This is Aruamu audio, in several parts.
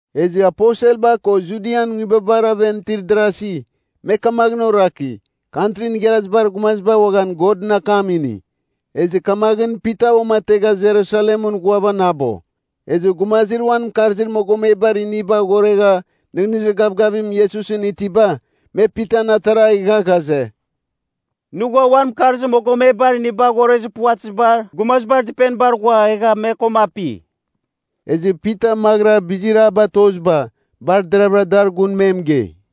Ezɨ aposelba ko Judian nguibabar aven itir darasi, me kamaghɨn oraki, Kantrin Igharazibar Gumaziba uaghan Godɨn akam ini. Ezɨ kamaghɨn Pita uamategha Jerusalemɨn ghuavanabo. Ezɨ gumazir uan mɨkarzir mogomebar iniba aghoregha nɨghnɨzir gavgavim Iesusɨn itiba, me Pitan atara egha ghaze, “Nɨ ghua uan mɨkarzir mogomebar iniba aghorezir puvatɨzibar gumazibar dɨpenibar ghua egha me koma api.” Ezɨ Pita maghɨra bizir a batoziba bar deravɨra dar gun me mɨgei,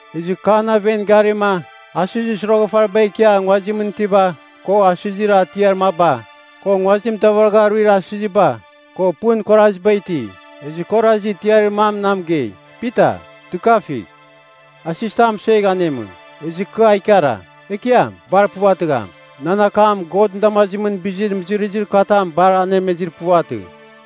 Ezɨ kɨ an aven garima, asɨzir soroghafariba ikia nguazimɨn itiba, ko asɨzir atiar maba, ko nguazimɨn davaragha aruir asɨziba, ko pɨn itir kuaraziba iti. Ezɨ kɨ orazi, tiarir mam na mɨgei, ‘Pita, dɨkavigh, asɨzitam mɨsuegh anemɨ.’ “Ezɨ kɨ a ikara, ‘Ekiam! Bar puvatɨgham! Nan akam Godɨn damazimɨn bizir mɨzɨrɨzir katam bar anemezir puvatɨ.’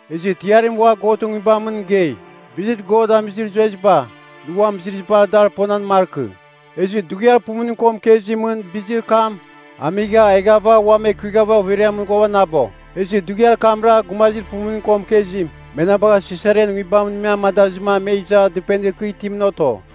“Ezɨ tiarim ua Godɨn Nguibamɨn mɨgei, ‘Bizir God amizir zueziba, nɨ uam mɨzɨrɨzibar dar ponan markɨ.’ Ezɨ dughiar pumuning ko mɨkezimɨn bizir kam amigha eghava ua ekuighava overiamɨn ghuavanabo. “Ezɨ dughiar kamra gumazir pumuning ko mɨkezim, me na bagha Sisarian nguibamɨn me amadazɨma me iza dɨpenir kɨ itimɨn oto.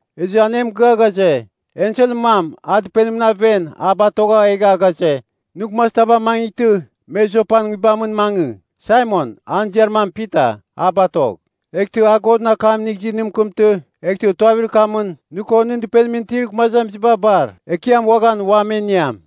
Ezɨ an e mɨgɨa ghaze, enselɨn mam an dɨpenimɨn aven a batogha egha ghaze, nɨ gumazitaba amangɨghtɨ, me Jopan nguibamɨn mangɨ, Saimon, an ziar mam Pita, a batogh. Eghtɨ a Godɨn akam inigh izɨ, nɨ mɨkɨmtɨ, eghtɨ tuavir kamɨn nɨ ko nɨn dɨpenimɨn itir gumazamiziba bar, Ekiam uaghan ua me iniam.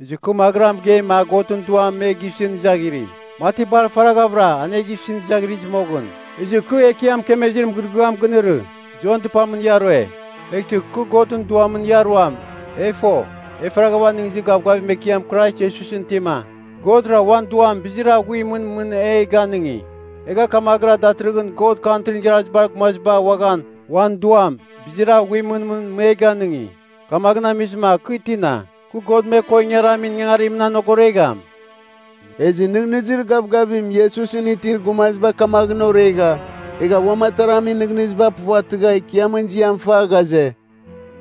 “Ezɨ kɨ maghɨra mɨgeima Godɨn Duam me gisɨn izaghiri, mati bar faraghavɨra an e gisɨn izaghirɨzɨ moghɨn. Ezɨ kɨ Ekiam mɨkemezir mɨgɨrɨgɨam ginɨrɨ, ‘Jon dɨpamɨn ia rue, eghtɨ kɨ Godɨn Duamɨn ia ruam.’ E fo, e faragha nɨghnɨzir gavgavim Ekiam Krais Iesusɨn itima, Godra uan Duam bizir aghuimɨn mɨn e ganɨngi. Egha kamaghɨra datɨrɨghɨn God Kantrin Igharazibar Gumaziba uaghan uan Duam, bizir aghuimɨn mɨn me ganɨngi. Kamaghɨn amizɨma kɨ tina, kɨ God me ko ingaramin ingangarimɨn anogoregham?” Ezɨ nɨghnɨzir gavgavim Iesusɨn itir gumaziba kamaghɨn oregha, egha uam ataramin nɨghnɨziba puvatɨgha Ekiamɨn ziam fa, ghaze,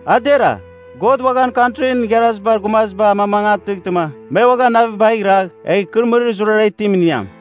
“A dera, God uaghan Kantrin Igharazibar Gumaziba amamangatɨghtɨma me uaghan navibagh iragh egh ikɨrɨmɨrir zurara itim iniam.”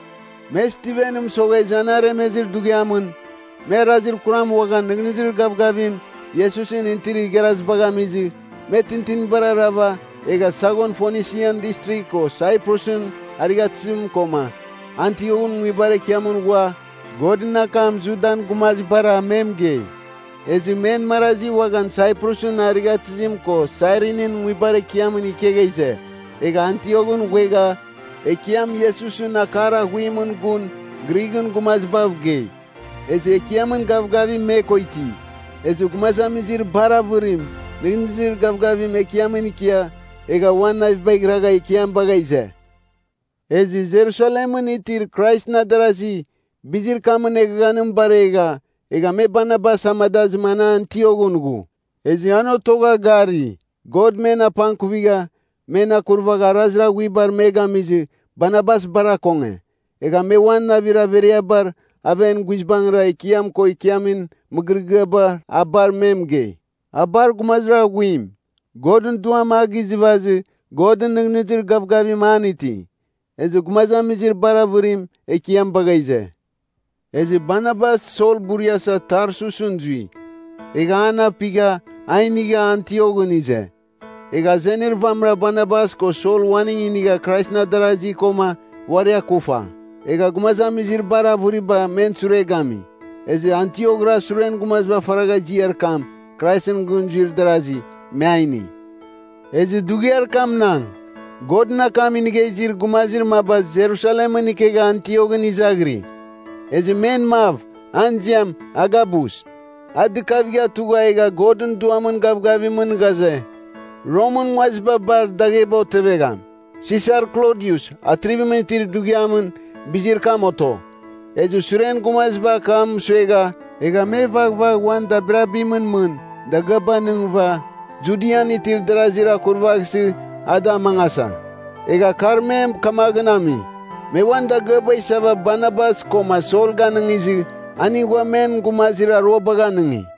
Me Stivenɨn mɨsoghezɨ an aremezir dughiamɨn, me arazir kuram uaghan nɨghnɨzir gavgavim Iesusɨn itir igharazibagh amizɨ, me tintinibar arava, egha saghon Fonisian Distrigh ko Saiprusɨn arighatɨzim koma Antioghɨn nguibar ekiamɨn ghua Godɨn akam Judan gumazibara me mɨgei. Ezɨ men marazi uaghan Saiprusɨn arighatɨzim ko Sairinin nguibar ekiamɨn ikegha ize, egha Antioghɨn ghuegha Ekiam Iesusɨn akar aghuimɨn gun Grighɨn gumazibav gei. Ezɨ Ekiamɨn gavgavim me ko iti. Ezɨ gumazamizir bar avɨrim nɨghnɨzir gavgavim Ekiamɨn ikia egha uan navibagh iragha Ekiam bagha ize. Ezɨ Jerusalemɨn itir Kraisɨn adarasi bizir kamɨn eghaghanim baregha, egha me Barnabas amadazɨma an Antioghɨn ghu. Ezɨ an otogha gari, God men apangkuvigha, men akurvagha arazir aghuibar me gamizɨ Barnabas bar akonge. Egha me uan navir averiabar aven guizbangɨra Ekiam ko ikiamin mɨgɨrɨgɨabar a bar me mɨgei. A bar gumazir aghuim, Godɨn Duam a gizɨvazɨ Godɨn nɨghnɨzir gavgavim an iti. Ezɨ gumazamizir bar avɨrim Ekiam bagha ize. Ezɨ Barnabas Sol buriasa Tarsusɨn zui. Egha an apigha, a inigha Antioghɨn ize. Egha azenir vamɨra Barnabas ko Sol uaning inigha Kraisɨn adarazi koma uari akufa. Egha gumazamizir bar avɨriba men sure gami. Ezɨ Antiokra suren gumaziba faragha ziar kam, Kraisɨn gɨn zuir darazi, me a ini. Ezɨ dughiar kamnang, Godɨn akam inigha izir gumazir maba Jerusalemɨn ikegha Antioghɨn izaghiri. Ezɨ men mav, an ziam Agabus, a dɨkavigha tugha egha Godɨn Duamɨn gavgavimɨn ghaze, Romɨn nguaziba bar dagheba otevegham. (Sisar Klodius, atrivimɨn itir dughiamɨn bizir kam oto.) Ezɨ suren gumaziba akam mɨsuegha egha me vaghvagh uan dabirabimɨn mɨn dagɨaba anɨngɨva, Judian itir darazir akurvaghsɨ a da amangasa. Egha kar me kamaghɨn ami, me uan dagɨaba isava, Barnabas koma Sol ganɨngizɨ, aning ghua men gumazir aruabagh anɨngi.